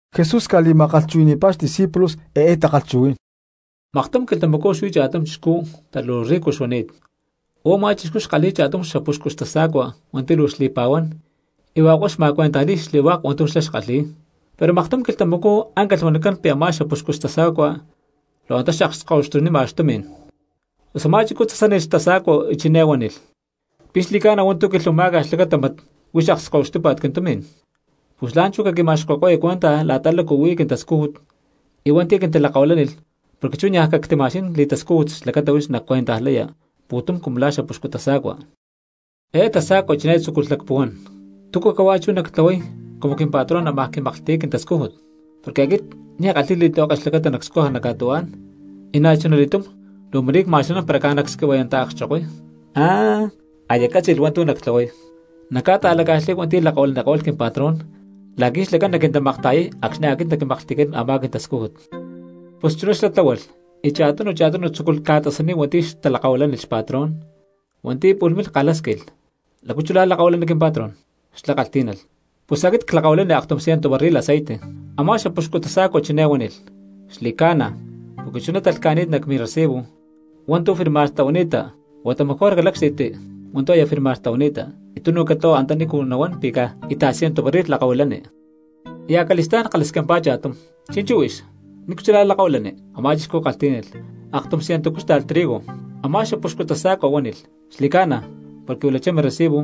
Jesús ca̠li̠ma̠kalhchuhui̠ni̠pá xdiscípulos eé takalhchuhuí̠n: —Maktum quilhtamacú xuí cha̠tum chixcú pero luu rico xuani̠t. Huá u̠má chixcú xkalhi̠y cha̠tum xapuxcu xtasa̠cua hua̠nti̠ luu xli̠pa̠huán, y hua̠k huá xma̠maktakalhni̠y xli̠hua̠k hua̠ntu̠ xlá xkalhi̠y. Pero maktum quilhtamacú áncalh huanicán pi̠ a̠má xapuxcu xtasa̠cua lhu̠hua antá xakskahuixtunima xtumi̠n. Pus a̠má chixcú tasánilh xtasa̠cua y ciné huánilh: “¿Pi̠ xli̠ca̠na hua̠ntu̠ quihuanimá̠ca xlacata hmat huix akskahuixtúpa̠t quintumi̠n? Pus la̠nchú caquima̠xqui̠ko̠ca cuenta la̠ta lácu huí quintascújut y hua̠nti̠ quintalakahuilánilh porque chú niaj cactima̠xquí̠n li̠tascújut xlacata huix nacuentajlaya pu̠tum cumu la̠ xapuxcu tasa̠cua.” Eé tasa̠cua chiné tzúculh lacpuhuán: “¿Túcu cahuá chú nactlahuay cumu quimpatrón ámaj quimaklhti̠y quintascújut? Porque aquit ni̠ ckalhi̠y li̠tlihueke xlacata nacscuja nac ca̠tuhuá̠n, y na̠chuna li̠túm luu ma̠rí cma̠xanán para caj nacsquihua̠yanta̠kchokoy. ¡Ah, aya ccátzi̠lh hua̠ntu̠ nactlahuay! Nacca̠ta̠laca̠xlay hua̠nti̠ lakahuilaniko̠lh quimpatrón la̠qui̠ xlacán naquintamakta̠yay acxni̠ aquit naquimaklhti̠cán a̠má quili̠tascújut.” Pus chuná xlá tláhualh y cha̠tunu cha̠tunu tzúculh ca̠tasaniy hua̠nti̠ xtalakahuilánilh xpatrón. Hua̠nti̠ pu̠lh milh kalhásquilh: “¿Lácu chuná lakahuilani quimpatrón?” Xlá kalhtí̠nalh: “Pus aquit clakahuilani aktum ciento barril aceite.” Amá xapuxcu tasa̠cua chiné huánilh: “Xli̠ca̠na, porque chuná talhca̠ni̠t nac mirecibo hua̠ntu̠ firmar tlahuani̠ta, huata mejor calácxti̠tti hua̠ntu̠ aya firmar tlahuani̠ta y tunu catlahua antanícu nahuán pi̠ caj íta̠t ciento barril lakahuilani.” Y acali̠stá̠n kalhasquimpá cha̠tum: “Chi̠nchú huix, ¿nícu chulá lakahuilani?” Amá chixcú kalhtí̠nalh: “Aktum ciento cúxta̠lh trigo.” Amá xapuxcu tasa̠cua huánilh: “Xli̠cána, porque huilachá mirecibo,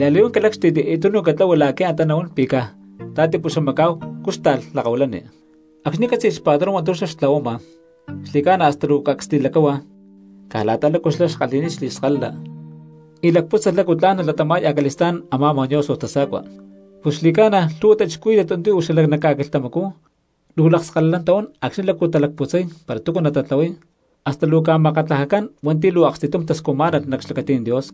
la̠li̠huán calácxti̠tti y tunu catlahua la̠qui̠ antá nahuán pi̠ caj ta̠tipuxamacá̠hu cúxta̠lh lakahuilani.” Acxni̠ cátzi̠lh xpatrón hua̠ntu̠ xtlahuama xli̠ca̠na hasta luu cacs li̠lacáhua caj la̠ta lácu xlá xkalhi̠ni̠t li̠skalala y lacpútzalh lácu tla̠n nalatama̠y acali̠stá̠n a̠má mañoso tasa̠cua. Pus xli̠ca̠na lhu̠hua cristianos hua̠nti̠ uú xala nac ca̠quilhtamacú luu lakskalalán tahuán acxni̠ lácu talacputzay para túcu natatlahuay hasta luu ca̠makatlajacán hua̠nti̠ luu aksti̠tum tascujmá̠nalh nac xlacatí̠n Dios.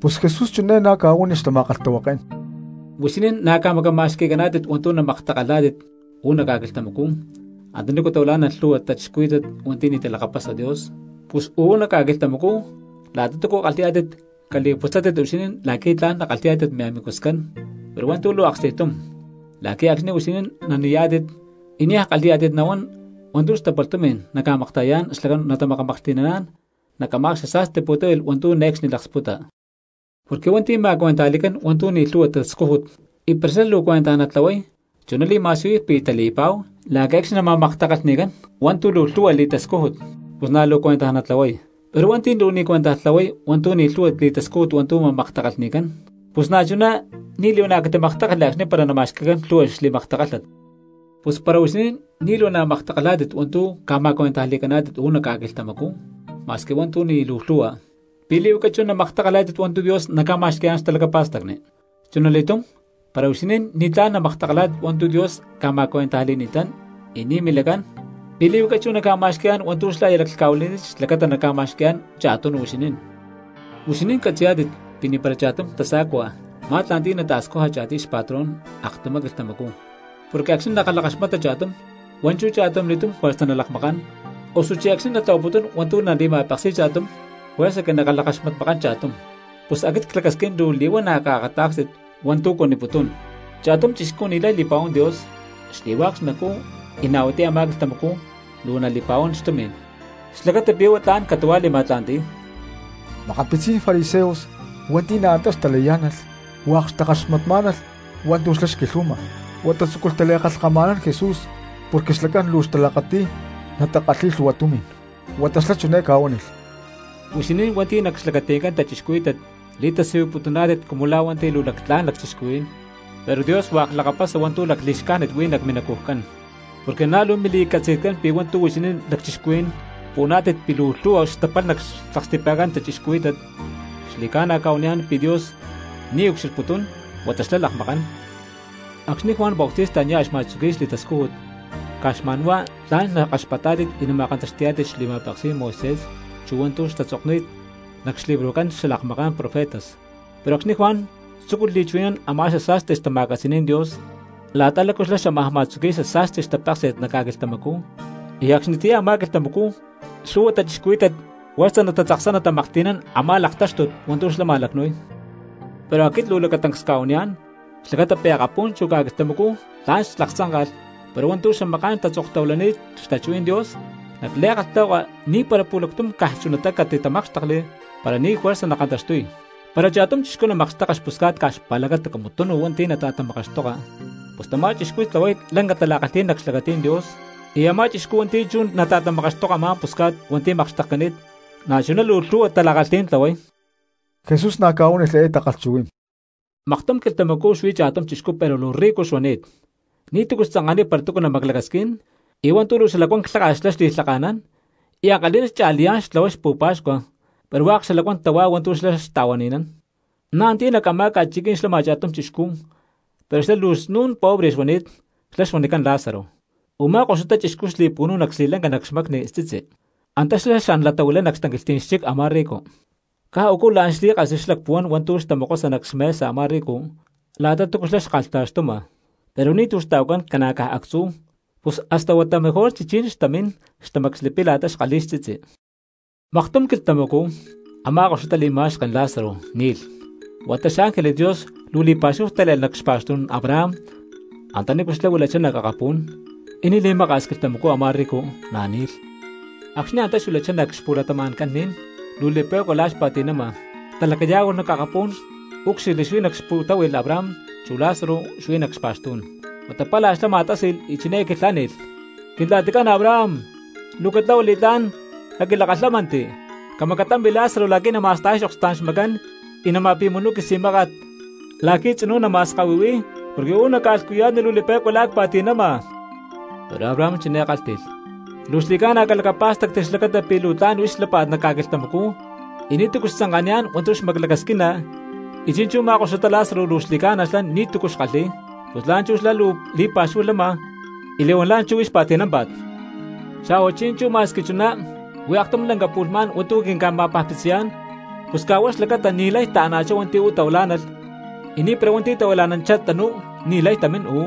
Pus Jesús chiné na̠ ca̠huánilh xtama̠kalhtahuaké̠n: —Huixinín na̠ ca̠macama̠xqui̠cani̠tátit hua̠ntu̠ namaktakalhá̠tit uú nac ca̠quilhtamacú antanícu tahuilá̠nalh lhu̠hua cristianos hua̠nti̠ ni̠ talakapasa Dios; pus uú nac ca̠quilhtamacú la̠ta túcu kalhi̠yá̠tit caca̠li̠putzátit huixinín la̠qui̠ tla̠n nakalhi̠yá̠tit miamigoscán pero hua̠ntu̠ luu aksti̠tum, la̠qui̠ acxni̠ huixinín nani̠yá̠tit y niaj kalhi̠yá̠tit nahuán hua̠ntu̠ xtapalh tumi̠n naca̠makta̠yayá̠n xlacán natamakamaklhti̠naná̠n nac a̠má xasa̠sti pu̠táhui̠lh hua̠ntu̠ ne̠cxni laksputa. ’Porque hua̠nti̠ ma̠cuentajli̠cán hua̠ntu̠ ni̠ luu lhu̠hua tascújut y para xlá luu cuentaj natlahuay chuná li̠ma̠siyuy pi̠ tali̠pa̠hu la̠qui̠ acxni̠ nama̠maktakalhni̠cán hua̠ntu̠ luu lhu̠hua li̠tascújut pus na̠ huá luu cuentaj natlahuay; pero hua̠nti̠ luu ni̠ cuentaj tlahuay hua̠ntu̠ ni̠ lhu̠hua li̠tascújut hua̠ntu̠ ma̠maktakalhni̠cán, pus na̠chuná ni̠ li̠huana̠ catimaktákalhli acxni̠ para nama̠xqui̠cán lhu̠hua xli̠maktakálhat. Pus para huixinín ni̠ li̠huana̠ maktakalhá̠tit hua̠ntu̠ ca̠ma̠cuentajli̠caná̠tit uú nac ca̠quilhtamacú ma̠squi hua̠ntu̠ ni̠ luu lhu̠hua, ¿pi̠ li̠huaca chú namaktakalhá̠tit hua̠ntu̠ Dios naca̠ma̠xqui̠yá̠n xtalacapa̠stacni? Chunali̠túm, para huixinín ni̠tlá̠n namaktakalhá̠tit hua̠ntu̠ Dios ca̠ma̠cuentajli̠ni̠tán y ni̠ milacán, ¿pi̠ li̠huaca chú naca̠ma̠xqui̠yá̠n hua̠ntu̠ xlá aya laclhca̠huili̠ni̠t xlacata naca̠ma̠xqui̠yá̠n cha̠tunu huixinín? ’Huixinín catzi̠yá̠tit pi̠ ni̠para cha̠tum tasa̠cua ma̠tla̠nti̠y naca̠ta̠scuja cha̠tiy xpatrón aktumá quilhtamacú, porque acxni̠ nakalhakaxmata cha̠tum, hua̠nchú cha̠tumli̠túm juerza nalakmakán; osuchí acxni̠ natlahuaputún hua̠ntu̠ nali̠ma̠paksi̠y cha̠tum juerza que nakalhakaxmatmakán cha̠tum. Pus aquit clacasquín luu li̠huana̠ caakatá̠kstit hua̠ntu̠ cuaniputún: cha̠tum chixcú ni̠lay li̠pa̠huán Dios xli̠hua̠k xnacú y na̠ huatiyá a̠má quilhtamacú luu nali̠pa̠huán xtumi̠n xlacata pi̠ huá tla̠n catu̠huá li̠ma̠tla̠nti̠y. Makapitzí̠n fariseos hua̠nti̠ na̠ antá xtalayá̠nalh hua̠k xtakaxmatmá̠nalh hua̠ntu̠ xlá xquilhuama, huata tzúculh tali̠kalhkama̠nán Jesús porque xlacán luu xtalakati̠y natakalhi̠y lhu̠hua tumi̠n. Huata xlá chiné ca̠huánilh: —Huixinín hua̠nti̠ nac xlacati̠ncán cristianos li̠tasiyuputuná̠tit cumu la̠ hua̠nti̠ luu lactlá̠n lacchixcuhuí̠n, pero Dios hua̠k lakapasa hua̠ntu̠ xali̠xcájnit huí nac minacujcán. Porque na̠ luu mili̠catzi̠tcán pi̠ hua̠ntu̠ huixinín lacchixcuhuí̠n puhuaná̠tit pi̠ luu lhu̠hua xtapalh nac xlaksti̠pa̠ncán cristianos, xli̠ca̠na cca̠huaniyá̠n pi̠ Dios ni̠ ucxilhputún, huata xlá lakmakán. ’Acxni̠ Juan Bautista nia̠ xma̠tzuqui̠y xli̠tascújut caj xma̠n huá tla̠n nakaxpatá̠tit y nama̠kantaxti̠yá̠tit xli̠ma̠peksí̠n Moisés chu hua̠ntu̠ xtatzokni̠t nac xlibrojcán xalakmaká̠n profetas; pero acxni̠ Juan tzúculh li̠chuhui̠nán a̠má xasa̠sti xtama̠catzi̠ní̠n Dios la̠ta lácu xlá xámaj ma̠tzuqui̠y xasa̠sti xtapeksi̠t nac ca̠quilhtamacú, y acxnitiyá a̠má quilhtamacú lhu̠hua cristianos juerza tatzaksamá̠nalh natamaklhti̠nán a̠má laktáxtut hua̠ntu̠ xlá ma̠lacnu̠y. Pero aquit luu lacatancs cca̠huaniyá̠n xlacata pi̠ akapú̠n chu ca̠quilhtamacú tla̠n xlaktzánka̠lh, pero hua̠ntu̠ xamaká̠n tatzoktahuilani̠ttá xtachuhuí̠n Dios nac li̠kalhtahuaka ni̠para pu̠lactum caj chunatá catitamákxtekli para ni̠ juerza nakantaxtuy. ’Para cha̠tum chixcú namakxteka xpusca̠t caj xpa̠lacata cumu tunu hua̠nti̠ nata̠tamakaxtoka, pus tamá chixcú tlahuay lanca tala̠kalhí̠n nac xlacatí̠n Dios; y a̠má chixcú hua̠nti̠ chú nata̠tamakaxtoka a̠má pusca̠t hua̠nti̠ makxtekcani̠t na̠chuná luu lhu̠hua tala̠kalhí̠n tlahuay. Jesús na̠ ca̠huánilh eé takalhchuhuí̠n: —Maktum quilhtamacú xuí cha̠tum chixcú pero luu rico xuani̠t. Ni̠túcu xtzanka̠niy para túcu namaclacasquín, y hua̠ntu̠ luu xalacuán lháka̠t xlá xli̠lhaka̠nán, y ankalhi̠ná xcha̠liyá̠n xtlahuay pu̠pa̠xcua pero hua̠k xalacuán tahuá hua̠ntu̠ xlá xta̠huani̠nán. Na̠ antiyá nac a̠má ca̠chiquí̠n xlama cha̠tum chixcú pero xlá luu snu̠n pobre xuani̠t xlá xuanicán Lázaro. Umá koxutá chixcú xli̠pu̠nu̠y nac xli̠lanca nac xmacni xtzitzi, antá xlá xan latahuilay nac xtanquilhtí̠n xchic a̠má ricu. Caj u̠cú la̠n xlí̠kasli xlacpuhuán hua̠ntu̠ xtamokosa nac xmesa a̠má ricu la̠ta túcu xlá xkalhta̠xtuma, pero ni̠tu̠ xta̠huacán ca̠na caj actzú, pus hasta huata mejor chichí̠n xtamín tamacslipiy la̠ta xkalhi̠y xtzitzi. Maktum quilhtamacú a̠má koxutá li̠ma̠xken Lázaro ni̠lh, huata xángeles Dios luu li̠pa̠xúhu tále̠lh nac xpa̠xtú̠n Abraham antanícu xlá huilachá nac akapú̠n, y ni̠ li̠maka̠s quilhtamacú a̠má rico na̠ ni̠lh. ’Acxni̠ antá xuilachá nac xpu̠latama̠ncán ni̠n luu li̠pe̠cua la̠ xpa̠ti̠nama, talacayá̠hualh nac akapú̠n úcxilhli xuí nac xpu̠táhui̠lh Abraham chu Lázaro antá xuí nac xpa̠xtú̠n. Huata palha xlá ma̠tási̠lh y chiné quilhánilh: “Quintla̠ticán Abraham, luu catlahua li̠tlá̠n, caquilakalhámanti, camacatampi Lázaro la̠qui̠ nama̠stajay xokspú̠n xmacán y napi̠munuy quisi̠máka̠t la̠qui̠ tzinú nama̠skahuihui̠y porque uú nac ca̠lhcuya̠tni luu li̠pe̠cua la̠ cpa̠ti̠nama.” Pero Abraham chiné kálhti̠lh: “Luu xli̠ca̠na calacapá̠stacti xlacata pi̠ luu tla̠n huix xlápa̠t nac ca̠quilhtamacú y ni̠tu̠cu xtzanka̠niyá̠n hua̠ntu̠ xmaclacasquina y chi̠nchú u̠má koxutá Lázaro luu xli̠ca̠na xlá ni̠tu̠cu xkalhi̠y; pus la̠nchú xlá luu li̠pa̠xúhu lama y li̠huán la̠nchú huix pa̠ti̠námpa̠t. Xa̠hua chi̠nchú ma̠squi chuná, huí aktum lanca pu̠lhmá̠n hua̠ntu̠ quinca̠ma̠pajpitziyá̠n; pus caj huá xlacata ni̠lay taana̠chá hua̠nti̠ uú tahuilá̠nalh, y na̠ ni̠para hua̠nti̠ tahuila̠nanchá tanú ni̠lay tamín uú.”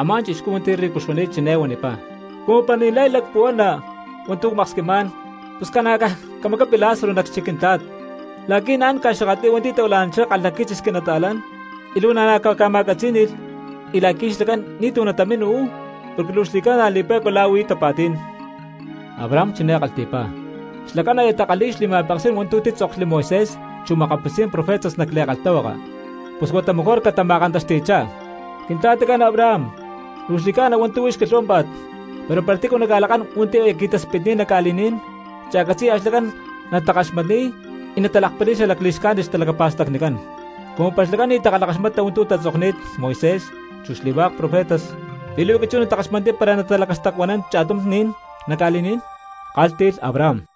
’Amá chixcú hua̠nti̠ ricu xuani̠t chiné huanipá: “Cumu para ni̠lay lacpuhuana hua̠ntu̠ cmaksquimá̠n, pus ca̠na caj camacapi Lázaro nac xchic quintla̠t, la̠qui̠ naán ca̠xakatli̠y hua̠nti̠ tahuila̠nanchá kalhaquitzis quinata̠lán, y luu naca̠ma̠akata̠ksni̠y la̠qui̠ xlacán ni̠tu̠ natamín uú, porque luu xli̠ca̠na li̠pé̠cua la̠ huí tapa̠tí̠n.” Abraham chiné kalhti̠pá: “Xlacán aya takalhi̠y xli̠ma̠peksí̠n hua̠ntu̠ títzokli Moisés chu makapitzí̠n profetas nac li̠kalhtahuaka, pus huata mejor huá catama̠kantaxti̠chá.” “Quintla̠ticán Abraham, luu xli̠ca̠na hua̠ntu̠ huix quilhuámpa̠t, pero para tícu naca̠lakán hua̠nti̠ aya qui̠taspitni̠ttá nac ca̠li̠ní̠n, cha̠catzi̠ya xlacán natakaxmatniy y natalakpali̠y xali̠xcájnit xtalacapa̠stacnicán.” “Cumu para xlacán ni̠ takalhakaxmata hua̠ntu̠ tatzokni̠t Moisés chu xli̠hua̠k profetas, ¿pi̠ li̠huaca chú natakaxmatniy para nalacastacuanán cha̠tum ni̠n nac ca̠li̠ní̠n?”, kálhti̠lh Abraham.